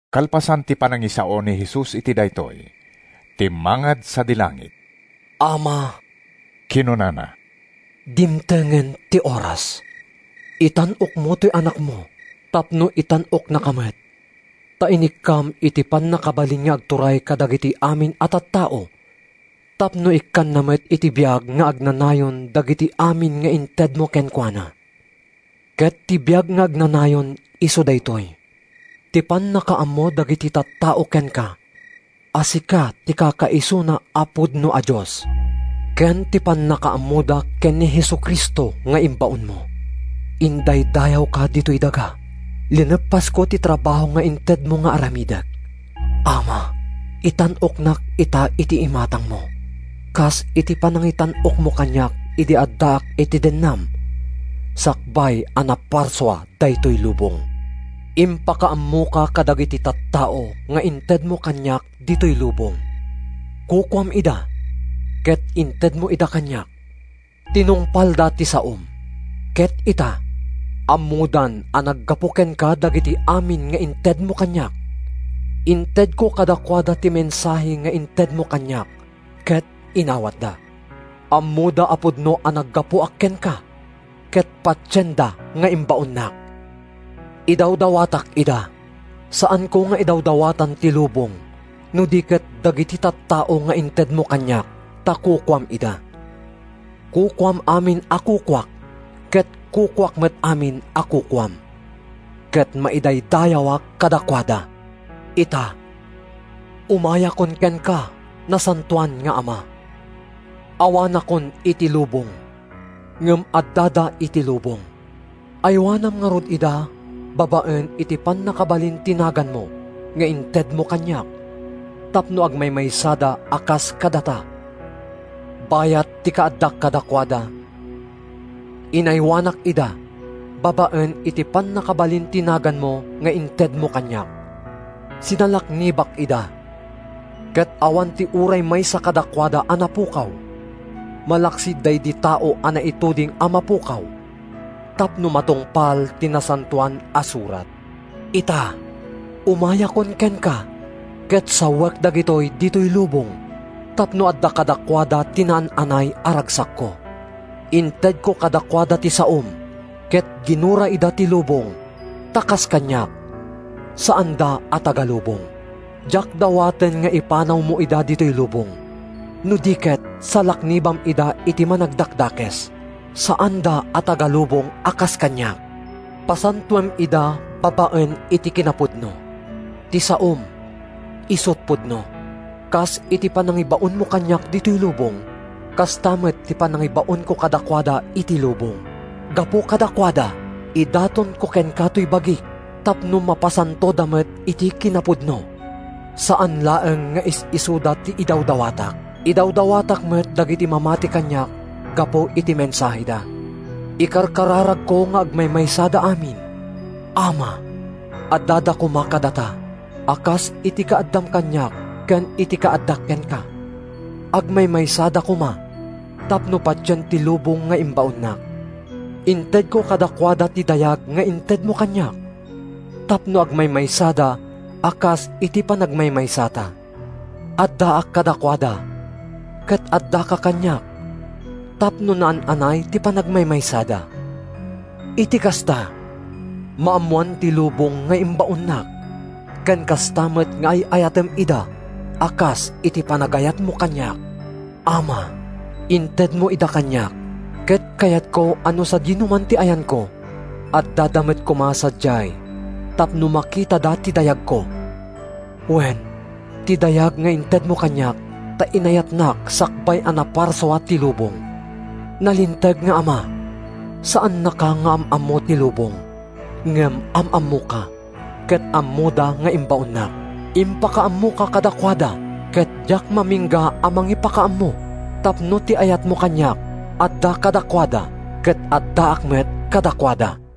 Kalpasan ti panangisao ni Jesus iti daytoy, timmangad sadi langit. “Ama,” kinunana, “dimtengen ti oras. Itan-okmo toy Anakmo tapno itan-oknaka met. Ta inikkam iti pannakabalin nga agturay kadagiti amin a tattao tapno ikkanna met iti biag nga agnanayon dagiti amin nga intedmo kenkuana. Ket ti biag nga agnanayon isu daytoy: ti pannakaammo dagiti tattao kenka, a sika ti kakaisuna a pudno a Dios, ken ti pannakaammoda ken ni Jesu-Cristo nga imbaonmo. Indaydayawka ditoy daga. Lineppasko ti trabaho nga intedmo nga aramidek. Ama, itan-oknak ita iti imatangmo, kas iti panangitan-okmo kaniak idi addaak iti dennam sakbay a naparsua daytoy lubong. “Impakaammoka kadagiti tattao nga intedmo kaniak ditoy lubong. Kukuam ida, ket intedmo ida kaniak. Tinungpalda ti saom, ket ita, ammodan a naggapu kenka dagiti amin nga intedmo kaniak. Intedko kadakuada ti mensahe nga intedmo kaniak, ket inawatda. Ammoda a pudno a naggapuak kenka ket patienda nga imbaonnak. “Idawdawatak ida. Saanko nga idawdawatan ti lubong no di ket dagiti tattao nga intedmo kaniak, ta kukuam ida. Kukuam amin a kukuak ket kukuak met amin a kukuam. Ket maidaydayawak kadakuada. Ita, umayakon kenka, Nasantoan nga Ama. Awanakon iti lubong, ngem addada iti lubong. Aywanam ngarud ida babaen iti pannakabalin ti naganmo nga intedmo kaniak tapno agmaymaysada a kas kadata. Bayat ti kaaddak kadakuada, inaywanak ida babaen iti pannakabalin ti naganmo nga intedmo kaniak. Sinalaknibak ida, ket awan ti uray maysa kadakuada a napukaw, malaksid daydi tao a naituding a mapukaw tapno matungpal ti Nasantoan a Surat. Ita, umayakon kenka, ket sawek dagitoy ditoy lubong tapno adda kadakuada ti naan-anay a ragsakko. Intedko kadakuada ti saom ket ginura ida ti lubong ta kas kaniak, saanda a taga-lubong. Diak dawaten nga ipanawmo ida ditoy lubong, no di ket salaknibam ida iti Managdakdakes. Saanda a taga-lubong a kas kaniak. Pasantoem ida babaen iti kinapudno. Ti saom isut’ pudno. Kas iti panangibaonmo kaniak ditoy lubong, kasta met ti panangibaonko kadakuada iti lubong. Gapu kadakuada, idatonko kenka toy bagik tapno mapasantoda met iti kinapudno. “Saan laeng nga is-isuda ti idawdawatak. Idawdawatak met dagiti mamati kaniak gapu iti mensaheda. Ikarkararagko nga agmaymaysada amin. Ama, addada koma kadata, a kas iti kaaddam kaniak ken iti kaaddak kenka. Agmaymaysada koma tapno patien ti lubong nga imbaonnak. Intedko kadakuada ti dayag nga intedmo kaniak tapno agmaymaysada a kas iti panagmaymaysata. Addaak kadakuada ket addaka kaniak tapno naan-anay ti panagmaymaysada. Iti kasta, maammoan ti lubong nga imbaonnak ken kasta met nga ay-ayatem ida a kas iti panagayatmo kaniak. “Ama, intedmo ida kaniak, ket kayatko a no sadinoman ti ayanko, addada met koma sadiay tapno makitada ti dayagko. Wen, ti dayag nga intedmo kaniak, ta inayatnak sakbay a naparsua ti lubong. Nalinteg nga Ama, saannaka nga am-ammo ti lubong, ngem am-ammoka, ket ammoda nga imbaonnak. Impakaammoka kadakuada, ket diak mamingga a mangipakaammo tapno ti ayatmo kaniak adda kadakuada ket addaak met kadakuada.”